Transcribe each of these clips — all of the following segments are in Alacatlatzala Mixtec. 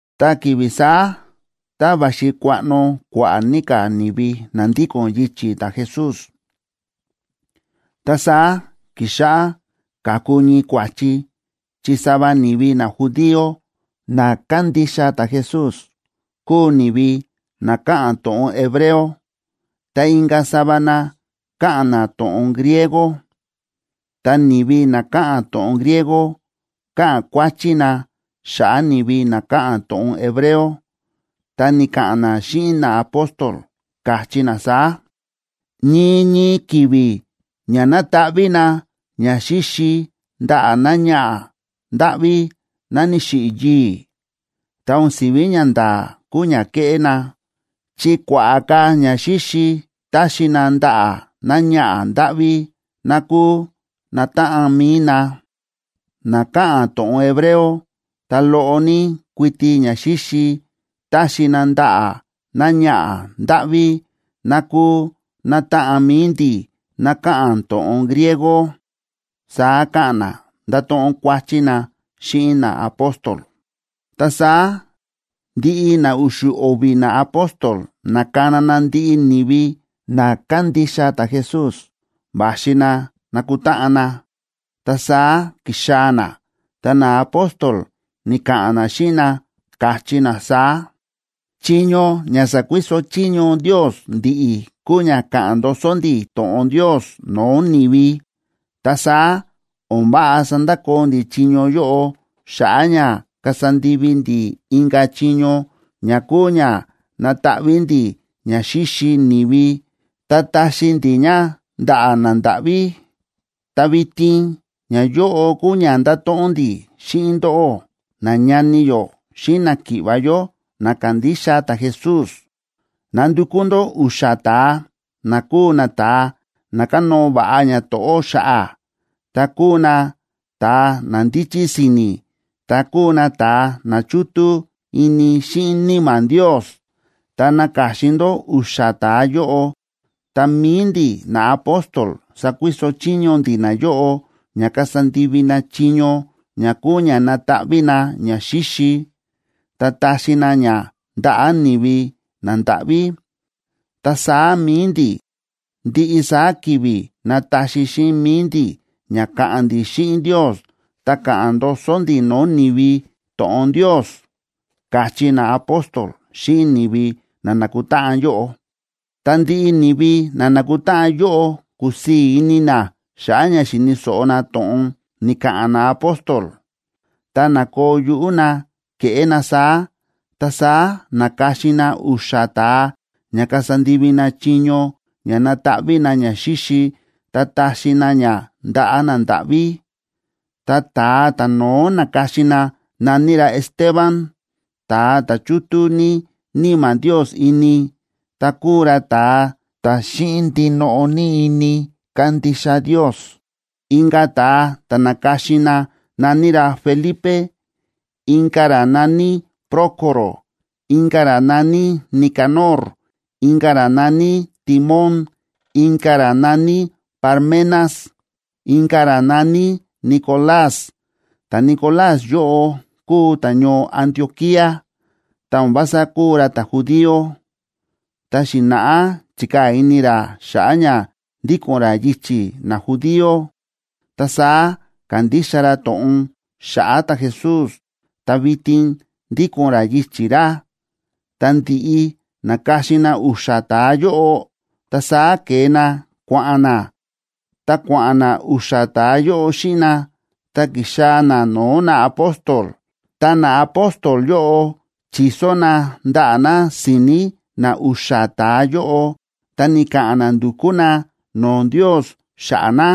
Ta ki̱vi̱ saá, tá va̱xi kuaꞌno kua̱ꞌa̱ ní ka̱ ni̱vi na ndíko̱n yichi̱ ta̱Jesús, ta saá ki̱xáꞌá káku ñii kua̱chi chi sava ni̱vi najudío na kándixa ta̱Jesús kúu ni̱vi na káꞌa̱n to̱ꞌon hebreo, ta inka̱ sava na káꞌa̱n na to̱ꞌon griego. Ta ni̱vi na káꞌa̱n to̱ꞌon griego káꞌa̱n kuáchí na xa̱ꞌa̱ ni̱vi na káꞌa̱n to̱ꞌon hebreo, ta̱ ni̱ka̱ꞌa̱n na xíꞌin naapóstol, káchí na saá: ―Ñii ñii ki̱vi̱ ña nátaꞌví na ñaxíxi ndaꞌa̱ náñaꞌa̱ ndáꞌví ná ni̱xiꞌi̱ yii̱, ta̱ o̱n si̱ví ñanda̱a̱ kúu ña kéꞌé na, chi kua̱ꞌa̱ ka̱ ñaxíxi táxi na ndaꞌa̱ náñaꞌa̱ ndáꞌví ná kúu nátáꞌan mi̱i na, ná káꞌa̱n to̱ꞌon hebreo, ta loꞌo ní kuiti ñaxíxi táxi na ndaꞌa̱ náñaꞌa̱ ndáꞌví ná kúu nátáꞌan mi̱i ndi̱ ná káꞌa̱n to̱ꞌon griego ―saá káꞌa̱n na, ndáto̱ꞌon kuáchí na xíꞌin naapóstol. Ta saá ndiꞌi na u̱xu̱ o̱vi̱ naapóstol na̱kana na ndiꞌi ni̱vi na kándixa ta̱Jesús va̱xi na nakutáꞌan na, ta saá ki̱xaa̱ na. Ta naapóstol ni̱ka̱ꞌa̱n na xíꞌin na, káchí na saá: ―Chiño ña sa̱kuiso chiño Ndios ndi̱ꞌi̱ kúu ña ka̱ꞌa̱n ndoso ndi̱ to̱ꞌon Ndios no̱o̱ ni̱vi. Ta saá o̱n váꞌa sandakoo ndi̱ chiño yóꞌo xa̱ꞌa̱ ña kasa ndivi ndi̱ inka̱ chiño ña kúu ña nátaꞌví ndi̱ ña xíxi ni̱vi ta táxi ndi̱ ña ndaꞌa̱ nandáꞌví. Ta vitin, ñayóꞌo kúu ña ndáto̱ꞌon ndi̱ xíꞌin ndóꞌó, nañani yó xíꞌin náki̱ꞌva̱ yó na kándixa ta̱Jesús. Nandukú ndó u̱xa̱ ta̱a, na kúu nata̱a na kánóo va̱ꞌa ñato̱ꞌó xa̱ꞌa̱, ta kúu nata̱a na ndíchí si̱ni̱, ta kúu nata̱a na chútú ini xíꞌin Níma̱ Ndios. Tá naka̱xin ndó u̱xa̱ ta̱a yóꞌo, ta mi̱i ndi̱ naapóstol sakuiso chiño ndi̱ nayóꞌo ña kasa ndivi na chiño ña kúu ña nataꞌví na ñaxíxi, ta taxi na ña ndaꞌa̱ ni̱vi nandáꞌví. Ta saá mi̱i ndi̱ ndiꞌi saá ki̱vi̱ nataxi xíꞌin mi̱i ndi̱ ña ka̱ꞌa̱n ndi̱ xíꞌin Ndios, ta ka̱ꞌa̱n ndoso ndi̱ no̱o̱ ni̱vi to̱ꞌon Ndios ―káchí naapóstol xíꞌin ni̱vi na na̱kutáꞌan yóꞌo. Ta ndiꞌi ni̱vi na na̱kutáꞌan yóꞌo kúsii̱ ini na xa̱ꞌa̱ ña xi̱ni̱ so̱ꞌo na to̱ꞌon ni̱ka̱ꞌa̱n naapóstol, ta na̱koo yuꞌú na keꞌé na saá. Ta saá na̱ka̱xin na u̱xa̱ ta̱a ña kasa ndivi na chiño ña nataꞌví na ñaxíxi ta taxi na ña ndaꞌa̱ nandáꞌví. Ta ta̱a ta̱no̱ó na̱ka̱xin na na̱ní ra Esteban, ta̱a ta̱ chútú ní Níma̱ Ndios ini, ta kúu ra ta̱a ta̱ xíꞌin ndinoꞌo ní ini kándixa Ndios. Inka̱ ta̱a ta̱ na̱ka̱xin na na̱ní ra Felipe, inka̱ ra na̱ní Prócoro, inka̱ ra na̱ní Nicanor, inka̱ ra na̱ní Timón, inka̱ ra na̱ní Parmenas, inka̱ ra na̱ní Nicolás. Ta̱Nicolás yóꞌo kúu ta̱ñoo Antioquía, ta o̱n vása kúu ra ta̱judío, ta xi̱na̱ꞌá chi̱kaa̱ ini ra xa̱ꞌa̱ ña ndíko̱n ra yichi̱ najudío, ta saá ka̱ndixa ra to̱ꞌon xa̱ꞌa̱ ta̱Jesús ta vitin ndíko̱n ra yichi̱ ra. Tá ndi̱ꞌi na̱ka̱xin na u̱xa̱ ta̱a yóꞌo, ta saá ke̱e na kua̱ꞌa̱n na, ta kua̱ꞌa̱n na u̱xa̱ ta̱a yóꞌo xíꞌin na, ta ki̱xaa̱ na no̱o̱ naapóstol. Ta naapóstol yóꞌo chi̱so na ndaꞌa̱ na si̱ni̱ na u̱xa̱ ta̱a yóꞌo, ta ni̱ka̱ꞌa̱n na ndu̱kú na no̱o̱ Ndios xa̱ꞌa̱ na.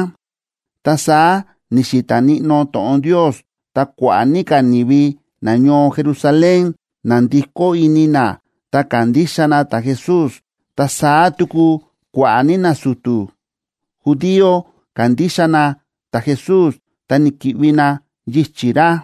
Ta saá ni̱xi̱ta̱ níꞌnó to̱ꞌon Ndios, ta kua̱ꞌa̱ ní ka̱ ni̱vi nañoo Jerusalén na̱ndikó ini na, ta ka̱ndixa na ta̱Jesús, ta saá tuku kua̱ꞌa̱ ní nasu̱tu̱ judío ka̱ndixa na ta̱Jesús ta ni̱ki̱ꞌvi na yichi̱ ra.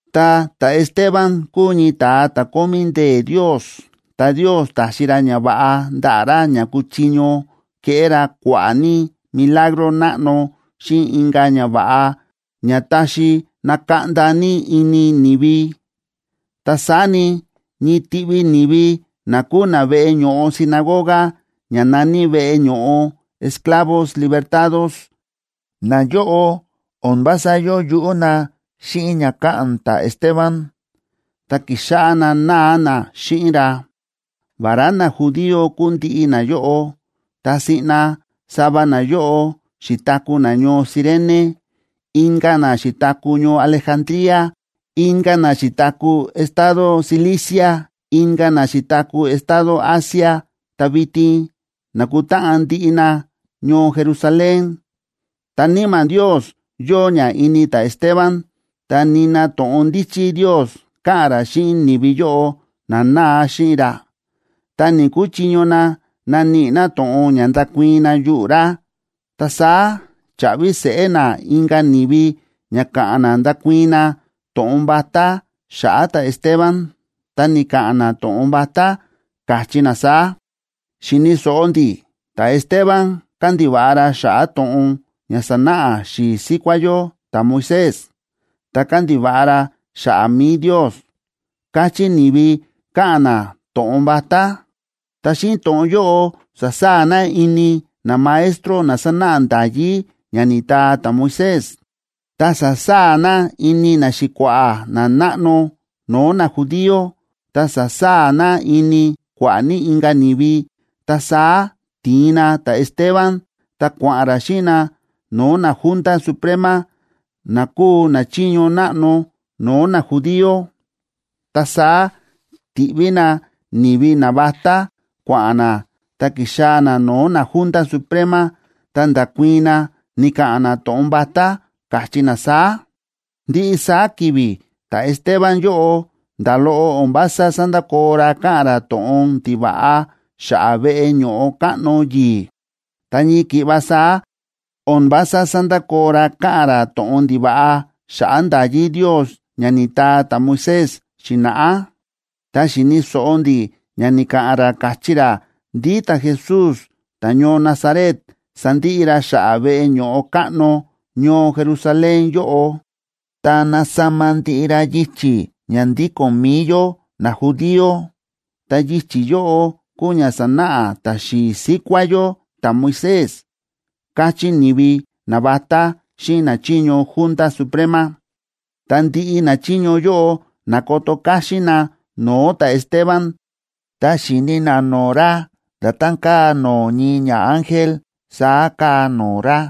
Ta ta̱Esteban kúu ñii ta̱a ta̱ kómí ndee̱ Ndios, ta Ndios ta̱xi ra ñava̱ꞌa ndaꞌa̱ ra ña kúchiño keꞌé ra kua̱ꞌa̱ ní milagro náꞌno xíꞌin inka̱ ñava̱ꞌa ña ta̱xi na̱kaꞌnda ní ini ni̱vi. Ta saá ni, ñii tiꞌvi ni̱vi na kúu na veꞌe ño̱ꞌo sinagoga ña na̱ní Veꞌe Ño̱ꞌo Esclavos Libertados, nayóꞌo o̱n vása yóo yuꞌú na xíꞌin ña káꞌa̱n ta̱Esteban, ta ki̱xáꞌá na náa na xíꞌin ra. Vará najudío kúu ndiꞌi nayóꞌo, ta siꞌna sava nayóꞌo xi̱taku̱ na ñoo Cirene, inka̱ na xi̱taku̱ ñoo Alejandría, inka̱ na xi̱taku̱ estado Cilicia, inka̱ na xi̱taku̱ estado Asia, ta vitin na̱kutáꞌan ndiꞌi na ñoo Jerusalén. Ta Níma̱ Ndios yóo ña ini ta̱Esteban, ta nina to̱ꞌon ndíchí Ndios káꞌa̱n ra xíꞌin ni̱vi yóꞌo na náa xíꞌin ra, ta ni̱‑kuchiño na naníꞌi na to̱ꞌon ña ndakuii̱n na yuꞌu̱ ra. Ta saá cha̱ꞌvi seꞌé na inka̱ ni̱vi ña ka̱ꞌa̱n na ndakuii̱n na to̱ꞌon vatá xa̱ꞌa̱ ta̱Esteban. Ta ni̱ka̱ꞌa̱n na to̱ꞌon vatá, káchí na saá: ―Xi̱ni̱ so̱ꞌo ndi̱ ta̱Esteban kándiva̱ꞌa ra xa̱ꞌa̱ to̱ꞌon ña sa̱náꞌa xi̱i̱ síkuá yó ta̱Moisés, ta kándiva̱ꞌa ra xa̱ꞌa̱ mi̱i Ndios ―káchí ni̱vi, káꞌa̱n na to̱ꞌon vatá. Ta xíꞌin to̱ꞌon yóꞌo sa̱saa̱ na ini namaestro na sánáꞌa nda̱yí ña ni̱taa ta̱Moisés, ta sa̱saa̱ na ini naxi̱kua̱ꞌa̱ nanáꞌno no̱o̱ najudío, ta sa̱saa̱ na ini kua̱ꞌa̱ ní inka̱ ni̱vi. Ta saá ti̱in na ta̱Esteban ta kua̱ꞌa̱n ra xíꞌin na no̱o̱ naJunta Suprema, na kúu nachiño náꞌno no̱o̱ najudío. Ta saá ti̱ꞌví na ni̱vi navatá, kua̱ꞌa̱n na ta ki̱xaa̱ na no̱o̱ naJunta Suprema, ta nda̱kuii̱n na, ni̱ka̱ꞌa̱n na to̱ꞌon vatá, káchí na saá: ―Ndiꞌi saá ki̱vi̱ ta̱Esteban yóꞌo nda̱ loꞌo o̱n vása sándakoo ra káꞌa̱n ra to̱ꞌon ndiva̱ꞌa xa̱ꞌa̱ veꞌe ño̱ꞌo káꞌno yi̱i̱, ta ñii ki̱ꞌva saá o̱n vása sándakoo ra káꞌa̱n ra to̱ꞌon ndiva̱ꞌa xa̱ꞌa̱ nda̱yí Ndios ña ni̱taa ta̱Moisés xi̱na̱ꞌá. Ta xi̱ni̱ so̱ꞌo ndi̱ ña ni̱ka̱ꞌa̱n ra káchí ra ndí ta̱Jesús ta̱ñoo Nazaret sandiꞌi ra xa̱ꞌa̱ veꞌe ño̱ꞌo káꞌno ñoo Jerusalén yóꞌo, ta nasama ndiꞌi ra yichi̱ ña ndíko̱n mi̱i yó najudío, ta yichi̱ yóꞌo kúu ña sa̱náꞌa ta̱xi̱i̱ síkuá yó ta̱Moisés ―káchí ni̱vi navatá xíꞌin nachiño Junta Suprema. Ta ndiꞌi nachiño yóꞌo na̱koto káxín na no̱o̱ ta̱Esteban, ta xi̱ni na no̱o̱ ra nda̱tán káa no̱o̱ ñii ñaángel saá káa no̱o̱ ra.